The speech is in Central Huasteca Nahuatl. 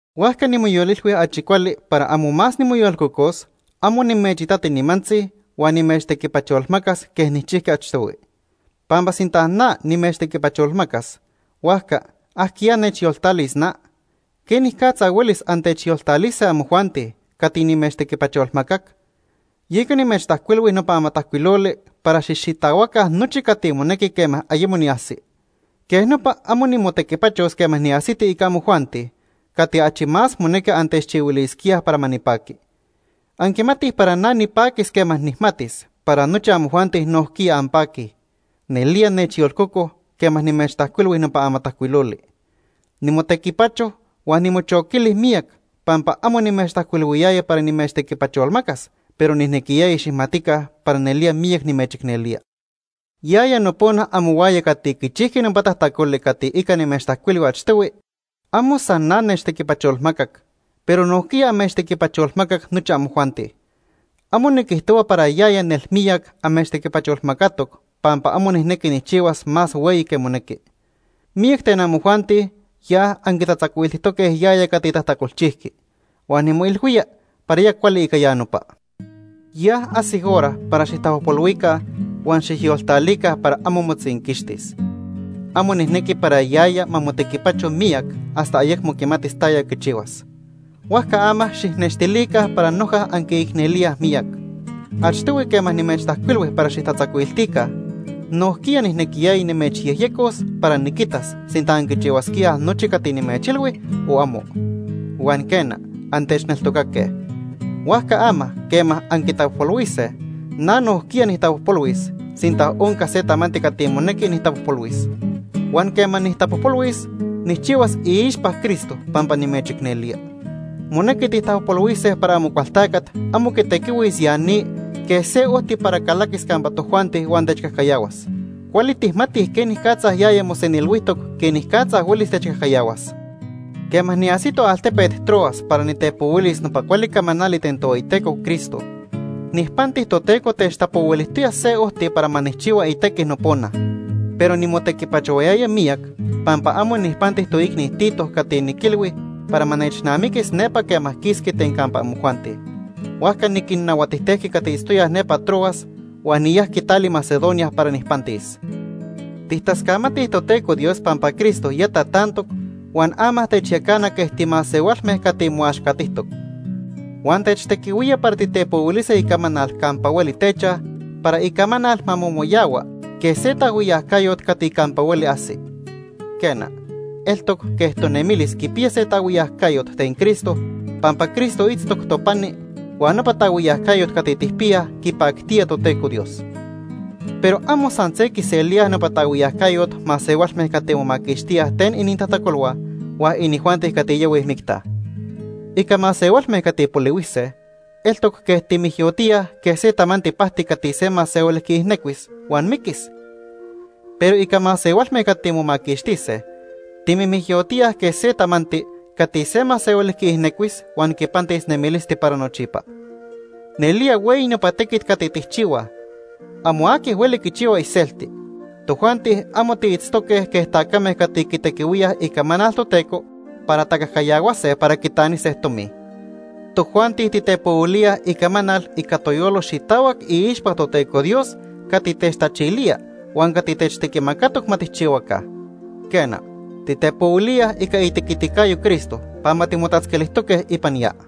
Huajca nimoyolilhui achi cuali para amo más nimoyolcocos, amo nimechitati nimantzi huan nimechtequipacholmacas quej nijchijqui achtohui. Pampa sinta na nimechtequipacholmacas, huajca ¿ajquiya nechyoltalis na? ¿Quenicatza huelis antechyoltalise amojuanti cati nimechtequipacholmacac? Yeca nimechtajcuilhui nopa amatajcuiloli para xijxitahuaca nochi cati monequi quema ayemo niajsi. Quej nopa amo nimotequipachos quema niajsiti ica amojuanti cati achi más monequi antechchihuilisquíaj para ma nipaqui. Anquimatij para na nipaquis quema nijmatis para nochi amojuanti nojquiya anpaquij. Nelía nechyolcoco quema nimechtajcuilhui nopa amatajcuiloli. Nimotequipacho huan nimochoquili miyac, pampa amo nimechtajcuilhuiyaya para nimechtequipacholmacas, pero nijnequiyaya xijmatica para nelía miyac nimechicnelía. Yaya nopona amohuaya cati quichijqui nopa tajtacoli cati ica nimechtajcuilhui achtohui, amo san na nechtequipacholmacac, pero nojquiya amechtequipacholmacatoc nochi amojuanti. Amo niquijtohua para yaya nelmiyac amechtequipacholmacatoc pampa amo nijnequi nijchihuas más hueyi que monequi. Miyac ten amojuanti ya anquitatzacuiltijtoque yaya cati tajtacolchijqui. Huan nimoilhuía para ya cuali ica ya nopa. Ya ajsic hora para xijtapojpolhuica huan xijyoltalica para amo motzinquixtis. Amo nijnequi para yaya ma motequipacho miyac hasta ayecmo quimatis taya quichihuas. Huajca ama xijnextilica para noja anquiicnelíaj miyac. Achtohui quema nimechtajcuilhui para xijtatzacuiltica, nojquiya nijnequiyaya nimechyejyecos para niquitas sinta anquichihuasquíaj nochi cati nimechilhui o amo. Huan, quena, antechneltocaque. Huajca ama quema anquitapojpolhuise, na nojquiya nijtapojpolhuis, sinta onca se tamanti cati monequi nijtapojpolhuis. Huan quema nijtapojpolhuis, nijchihuas iixpa Cristo pampa nimechicnelía. Monequi tijtapojpolhuise para Amocualtacat amo quitequihuis ya ni quej se ojti para calaquis campa tojuanti huan techcajcayahuas. Cuali tijmatij quenicatza yaya mosenilhuijtoc quenicatza huelis techcajcayahuas. Quema niajsito altepet Troas para nitepohuilis nopa cuali camanali ten Tohueyiteco Cristo, nijpanti Toteco techtapohuilijtoya se ojti para ma nijchihua itequi nopona, pero nimotequipachohuayaya miyac pampa amo nijpanti toicni Tito cati niquilhui para ma nechnamiquis nepa quema quisqui ten campa amojuanti. Huajca niquinnahuatijtejqui cati itztoyaj nepa Troas huan niyajqui tali Macedonia para nijpantis. Tijtascamatij Toteco Dios pampa Cristo ya tatantoc huan ama techyacana quej timasehualme cati moaxcatijtoc. Huan techtequihuía para titepohuilise icamanal campa hueli techaj, para icamanal ma momoyahua quej se taajhuiyacayot cati campa hueli ajsi. Quena, eltoc quej tonemilis quipiya se taajhuiyacayot ten Cristo pampa Cristo itztoc topani huan nopa taajhuiyacayot cati tijpiyaj quipactía Toteco Dios. Pero amo san se quiselíaj nopa taajhuiyacayot masehualme cati momaquixtíaj ten inintajtacolhua huan inijuanti cati yahuij micta. Ica masehualme cati polihuise, eltoc quej timijyotíaj quej se tamanti pajti cati se masehuali quiijnecuis huan miquis. Pero ica masehualme cati momaquixtise, timijmiyotíaj quej se tamanti cati se masehuali quiijnecuis huan quipantis nemilisti para nochipa. Nelía hueyi nopa tequit cati tijchihuaj. Amo aqui hueli quichihua iselti. Tojuanti amo tiitztoque quej tacame cati quitequihuíaj icamanal Toteco para tacajcayahuase para quitanise tomi. Tojuanti titepohuilíaj icamanal ica toyolo xitahuac iixpa Toteco Dios cati techtachilía huan cati techtequimacatoc ma tijchihuaca. Quena, titepohuilía ica itequiticayo Cristo pampa timotatzquilijtoque ipan ya.